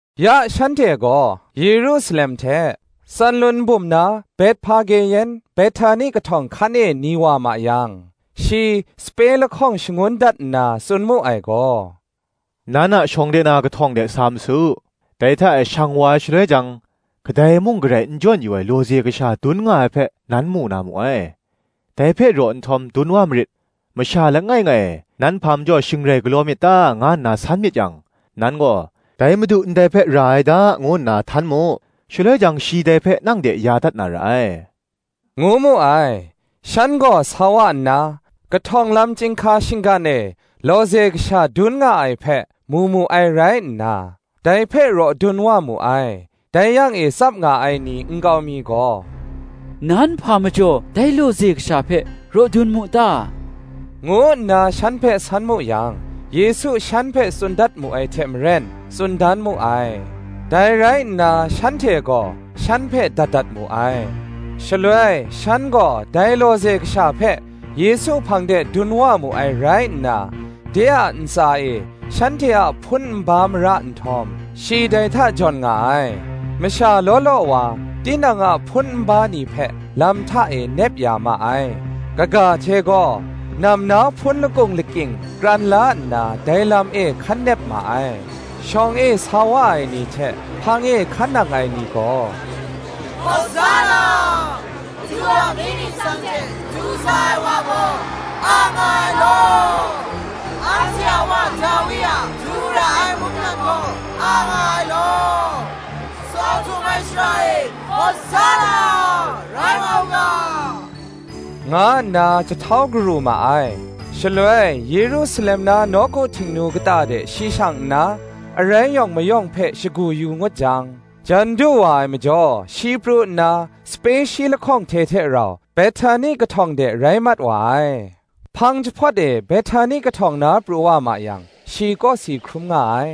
Ya shanhte gaw, Yerusalem hte, Tsanlun bum na Bethpage yan Behtani kahtawng hkan e ni wa ma yang, shi sape lahkawng shangun dat nna, tsun mu ai gaw, “Nan a shawng de na kahtawng de sa ma su: dai hta e shang wa ai shaloi jang, kadai mung garai n jawn yu ai lawze kasha dun nga ai hpe, nan mu na mu ai; dai hpe raw nhtawm dun wa marit. Masha langai ngai, ‘Nan hpa majaw shing rai galaw myit ta?’ nga nna san myit yang, nan gaw, ‘Dai Madu ndai hpe ra ai da,’ ngu nna htan mu: shaloi jang, shi dai hpe nang de ya dat na ra ai,” ngu mu ai. Shan gaw sa wa nna, kahtawng lam chyinghka shinggan e lawze kasha dun nga ai hpe, mu mu ai rai nna, dai hpe raw dun wa mu ai. Dai yang e tsap nga ai ni nkau mi gaw, “Nan hpa majaw dai lawze kasha hpe raw dun mu ta?” ngu nna shan hpe san mu yang, Yesu shan hpe tsun dat mu ai hte maren, tsun dan mu ai: dai rai nna shanhte gaw shan hpe dat dat mu ai. Shaloi shan gaw dai lawze kasha hpe Yesu hpang de dun wa mu ai rai nna, de a ntsa e shanhte a hpun nba mara nhtawm, shi dai hta jawn nga ai. Masha law law wa, tinang a hpun nba ni hpe lam hta e nep ya ma ai: kaga hte gaw, nam na hpun lakung lakying kran la nna, dai lam e hkan nep ma ai. Shawng e sa wa ai ni hte hpang e hkan nang ai ni gaw, “Hawsanna:” “Madu a mying ningsang hte du sa ai wa gaw, a nga ai law;” “Anhte a wa Dawi a du ra ai mungdan gaw, a nga ai law;” “Tsaw htum ai shara e, Hawsanna, rai wa u ga,” nga nna jahtau garu ma ai. Shaloi Yerusalem na nawku Htingnu kata de shi shang nna, arai yawng mayawng hpe shagu yu ngut jang, jan du wa ai majaw, shi pru nna, sape shi lahkawng hte hte rau, Behtani kahtawng de rai mat wa ai. Hpang jahpawt e Behtani kahtawng na pru wa ma yang, shi kawsi hkrum nga ai.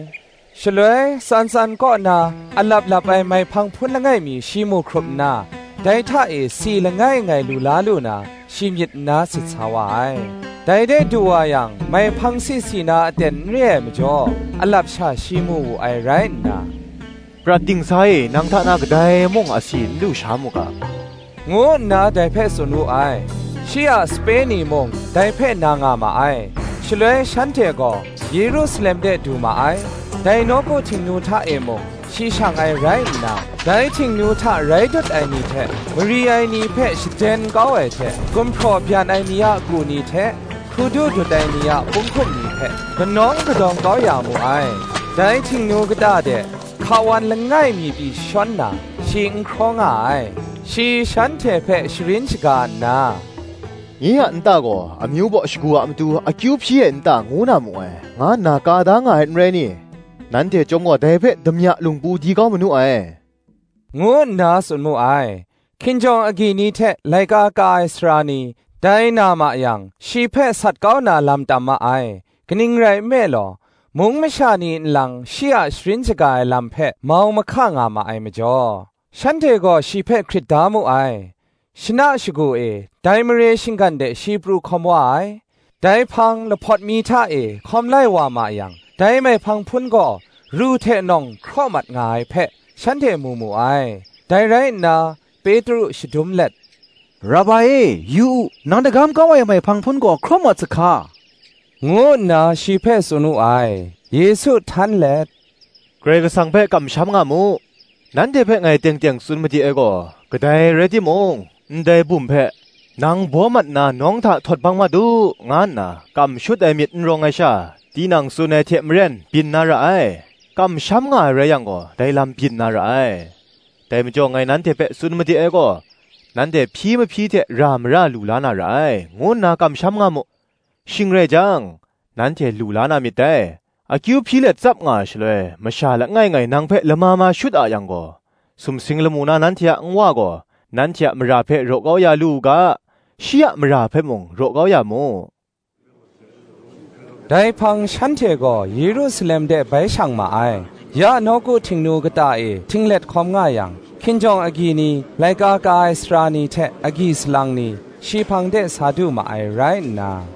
Shaloi tsan tsan kaw na, alap lap ai maihpang hpun langai mi shi mu hkrup nna, dai hta e si langai ngai lu la lu na, shi myit nna sit sa wa ai. Dai de du wa yang, maihpang si si na aten n re ai majaw, alap sha shi mu wu ai rai nna, “Prat dingsa e, nang hta na kadai mung asi n lusha mu ga,” ngu nna dai hpe tsun wu ai. Shi a sape ni mung dai hpe na nga ma ai. Shaloi shanhte gaw Yerusalem de du ma ai. Dai nawku Htingnu hta e mung, shi shang ai rai nna, dai Htingnu hta rai dut ai ni hte mari ai ni hpe shaden kau ai hte, gumhpraw byan ai ni a ku ni hte hkrudu dut ai ni a punghkum ni hpe kanawng kadang kau ya mu ai. Dai Htingnu kata de hka wan langai mi pyi jashawn na, shi n hkraw nga ai. Shi shanhte hpe sharin shaga nna, “Nye a nta gaw amyu baw shagu a matu akyu hpyi ai nta ngu na mu ai, nga nna ka da nga ai, n rai ni? nanhte chyawm gaw, dai hpe damya lungpu di kau manu ai,” ngu nna tsun mu ai. Hkinjawng agyi ni hte laika ka ai sara ni, dai na ma yang, shi hpe sat kau na lam tam ma ai: kaning rai nme law, mung masha ni nlang shi a sharin shaga ai lam hpe mau mahka nga ma ai majaw, shanhte gaw shi hpe hkrit da mu ai. Shana shagu e, dai mare shinggan de shi pru hkawm wa ai. Dai hpang lahpawt mi hta e hkawm lai wa ma yang, dai maihpang hpun gaw ru hte nawng hkraw mat nga ai hpe, shanhte mu mu ai. Dai rai nna, Petru shadum let, “Rabai e, yu u, nang dagam kau ai maihpang hpun gaw hkraw mat sahka!” ngu nna shi hpe tsun wu ai. Yesu htan let, “Karai Kasang hpe kamsham nga mu: nanhte hpe ngai teng teng tsun made ai gaw, kadai rai timung, ndai bum hpe, Nang baw mat nna nawng hta htawt bang mat u, nga nna kam shut ai myit n rawng ai sha, tinang tsun ai hte maren byin na ra ai, kamsham nga ai rai yang gaw dai lam byin na ra ai. Dai majaw ngai nanhte hpe tsun made ai gaw, Nanhte hpyi mahpyi hte ra mara lu la na ra ai, ngu nna kamsham nga mu: shing rai jang, nanhte lu la na myit dai. Akyu hpyi let tsap nga ai shaloi, masha langai ngai nang hpe lama ma shut a yang gaw, sumsing lamu na nanhte a Nwa gaw, nanhte a mara hpe raw kau ya lu u ga, shi a mara hpe mung, raw kau ya mu.” Dai hpang shanhte gaw Yerusalem de bai shang ma ai. Ya nawku Htingnu kata e htinglet hkawm nga yang, hkinjawng agyi ni, laika ka ai sara ni hte agyi salang ni, shi hpang de sa du ma ai rai nna,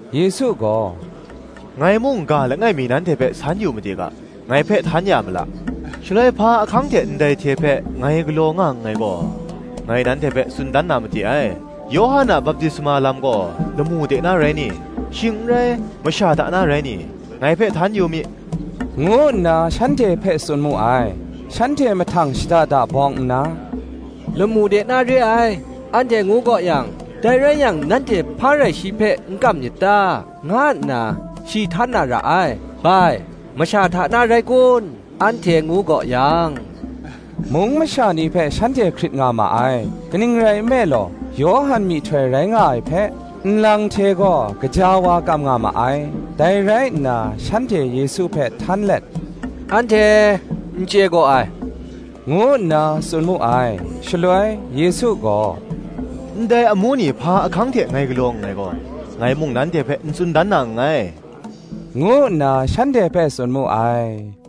Yesu gaw, “Ngai mung, ga langai mi nanhte hpe san yu made ga; ngai hpe htan ya mala, shaloi hpa ahkang hte ndai hte hpe ngai galaw nga nngai gaw, ngai nanhte hpe tsun dan na made ai: Yawhan a baptisma lam gaw, lamu de na rai ni? shing n rai, masha hta na rai ni? ngai hpe htan yu mi,” ngu nna shanhte hpe tsun mu ai. Shanhte mahtang shada da bawng nna, “Lamu de na re ai, anhte ngu gaw yang, ‘Dai rai yang nanhte hpa rai shi hpe n kam myit ta?’ nga nna, shi htan na ra ai: bai, ‘Masha hta na rai kun?’ anhte ngu gaw yang, mung masha ni hpe shanhte hkrit nga ma ai; kaning rai nme law, Yawhan myihtoi rai nga ai hpe, nlang hte gaw, gaja wa kam nga ma ai. Dai rai nna, shanhte Yesu hpe htan let, Anhte n chye gaw ai,” ngu nna tsun mu ai. Shaloi, Yesu gaw, “Ndai amu ni hpa ahkang hte ngai galaw nngai gaw, ngai mung nanhte hpe n tsun dan na nngai,” ngu nna shanhte hpe tsun mu ai.